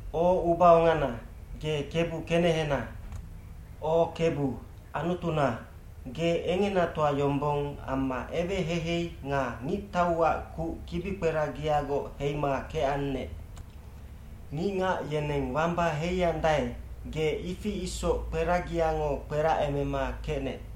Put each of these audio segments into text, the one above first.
O ubaongana, ge Kebu kenehena. O Kebu, Anutuna, ge engenatoa yombong amma eweheihei nga ngictauac kuc kibikperagiagoc heima kecannec. Ngicngac yeneng wamba heiandae, ge ifi isoc kperagiango kperacemema kecnec.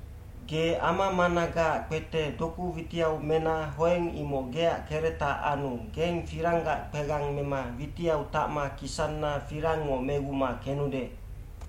Ge ama managaac kpete doku witiau mena hoeng imoc geac keretac anu geng firanggac kpegang mema witiau tacma kisanna firangngo meguma kenude.b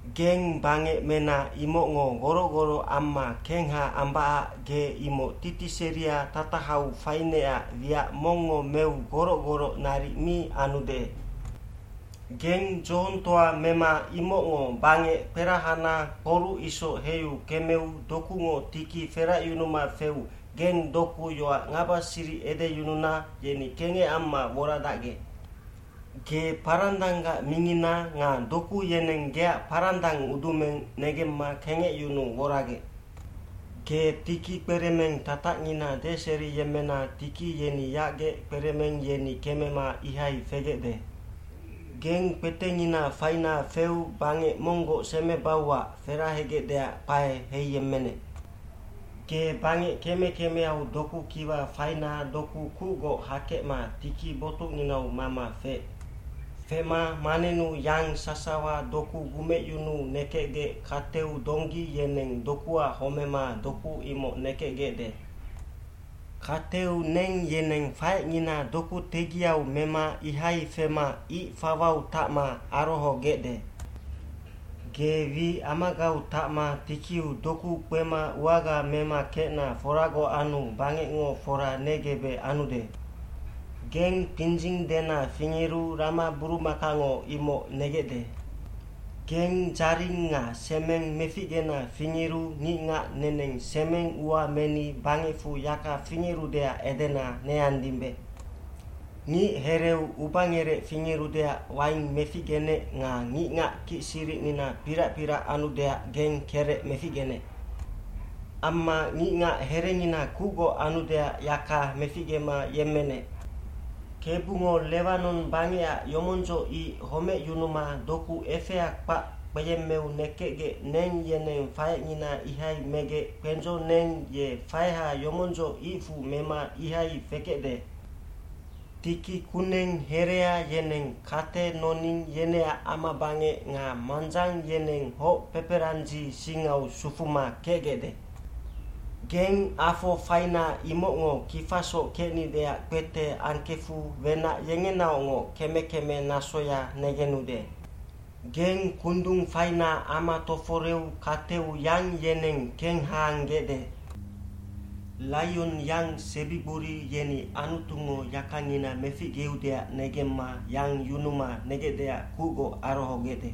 Geng bangec mena imocngo goroc goroc amma kengha ambacac ge imoc titiseria tatahau fainecac wiac mongngo meu goroc goroc naric mi anude. Geng dzohongtoa mema imocngo bangec kperahana kporuc isoc heiu kemeu dokungo tiki feracyunuma feu geng doku yoac ngabasiric edeyununa yeni kengec amma woradacgec. Ge parandanggac mingina nga doku yeneng geac parandang udumeng negemma kengecyunuu woragec. Ge tiki kperemeng tatacngina deseriyemmena tiki yeni yacgec kperemeng yeni kemema ihai fegecde. Geng kpetengina faina feu bangec monggoc semebauac ferahegecdeac kpae heiyemmenec.d Ge bangec keme kemeau doku kiwa faina doku kucgoc hakecma tiki botucnginau mama feec. Fema manennu yang sasawa doku gumecyunuu nekecgec kateu donggi yeneng dokuac homema doku imoc nekecgecde. Kateu neng yeneng faecngina doku tegiau mema ihai fema ic fawau tacma arohogecde. Ge wi amagau tacma tikiu doku kpema uaga mema kecna foragoc anu bangecngo fora negebec anude. Geng kpindzing dena fingeru ramaburumakango imoc negecde. Geng dzaring nga semeng meficgena fingeru ngicngac neneng semeng ua meni bangecfu yaka fingerudeac edena neandimbe. Ngichereu ubangerec fingerudeac waing meficgenec nga ngicngac kicsiricnina pirac pirac anudeac geng kerec meficgenec. Amma ngicngac herengina kucgoc anudeac yaka meficgema yemmenec. Kebungo Lewanon bangecac yomondzoc ic homecyunuma doku efea kpac kpeyemmeu nekecgec neng yeneng faecngina ihai megec kpendzo neng ye faeha yomondzoc icfu mema ihai fekecde. Tiki kuneng herea yeneng kate noning yeneac amabangec nga mandzang yeneng hoc peperandzi singau sufuma kecgecde. Geng afo faina imocngo kifasoc kecnideac kpete angkefu wenac yengenaocngoc keme keme nasoya negenude. Geng kundung faina ama toforeu kateu yang yeneng kenghaanggecde. Laionyang sebigbori yeni Anutungo yakangina meficgeudeac negemma yang yunuma negecdeac kucgoc arohogecde.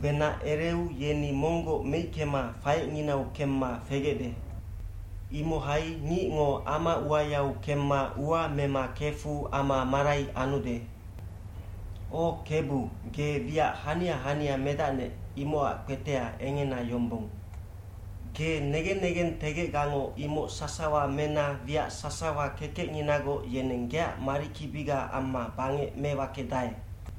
Wenac ereu yeni monggoc meickema faecnginau kemma fegecde. Imohai ngicngo ama uayau kemma ua mema kefu ama marai anude. O Kebu, ge wiac hania hania medacnec, imocac kpetea engena yombong. Ge negen negentegecgango imoc sasawa mena wiac sasawa kekecnginagoc yeneng geac marikibiga amma bangec mewakedae.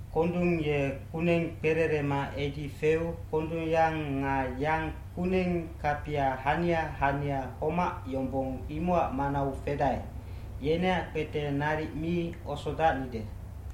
Kondung ye kuneng kpererema edi feu kondungyang nga yang kuneng kapia hania hania homac yombong imocac manau fedae, yeneac kpete naric mi osodacnide.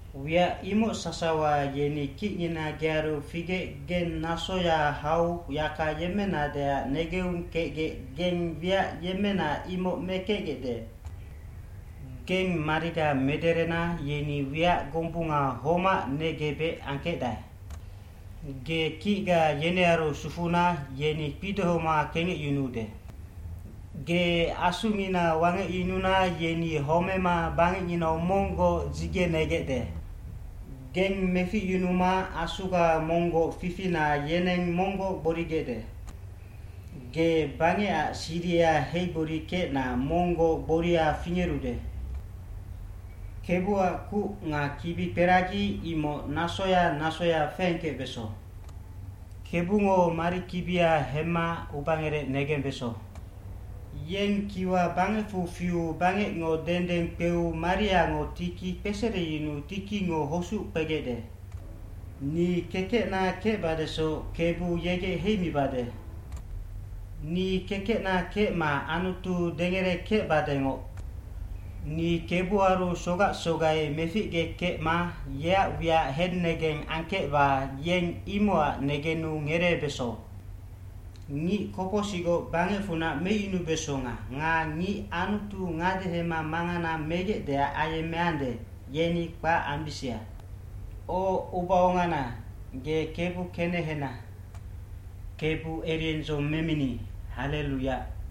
Wiac imoc sasawa yeni kicngina gearu figec geng nasoya hau yaka yemmenadeac negeung kecgec geng wiac yemmena imoc mekecgecde. Geng mariga mederena yeni wiac gombunga homac negebec angkecdae. Ge kicga yenearu sufuna yeni kpidohoma kengecyunuude. Ge asungina wangecyununa yeni homema bangecnginau monggoc dzigenegecde. Geng meficyunuma Asuga monggoc fifina yeneng monggoc gborigecde. Ge bangecac siriha heigborikecna monggoc gboria fingerude. Kebuac kuc nga kibikperagi imoc nasoya nasoya feengkecbeso. Kebungo marikibia hemma ubangerec negembeso. Yeng kiwa bangecfu fiu bangecngo dendeng kpeu mariango tiki kpesereyunuu tikingo hosuc kpegecde. Ni kekecna kecbadesoc Kebu yegec heimibade. Ni kekecna kecma Anutu dengerekecbadengoc. Ni kebuaru sogac sogai meficgekecma yeac wiac hennegeng angkecba yeng imocac negenu ngereebeso. Ngic kopocsicgoc bangecfunac meicyunubesonga nga ngic Anutu ngadehema mangana megecdeac ayemmeande, yeni kpac ambisia. O ubaongana, ge Kebu kenehena.f Kebu eriendzong memini, hallelu Yac.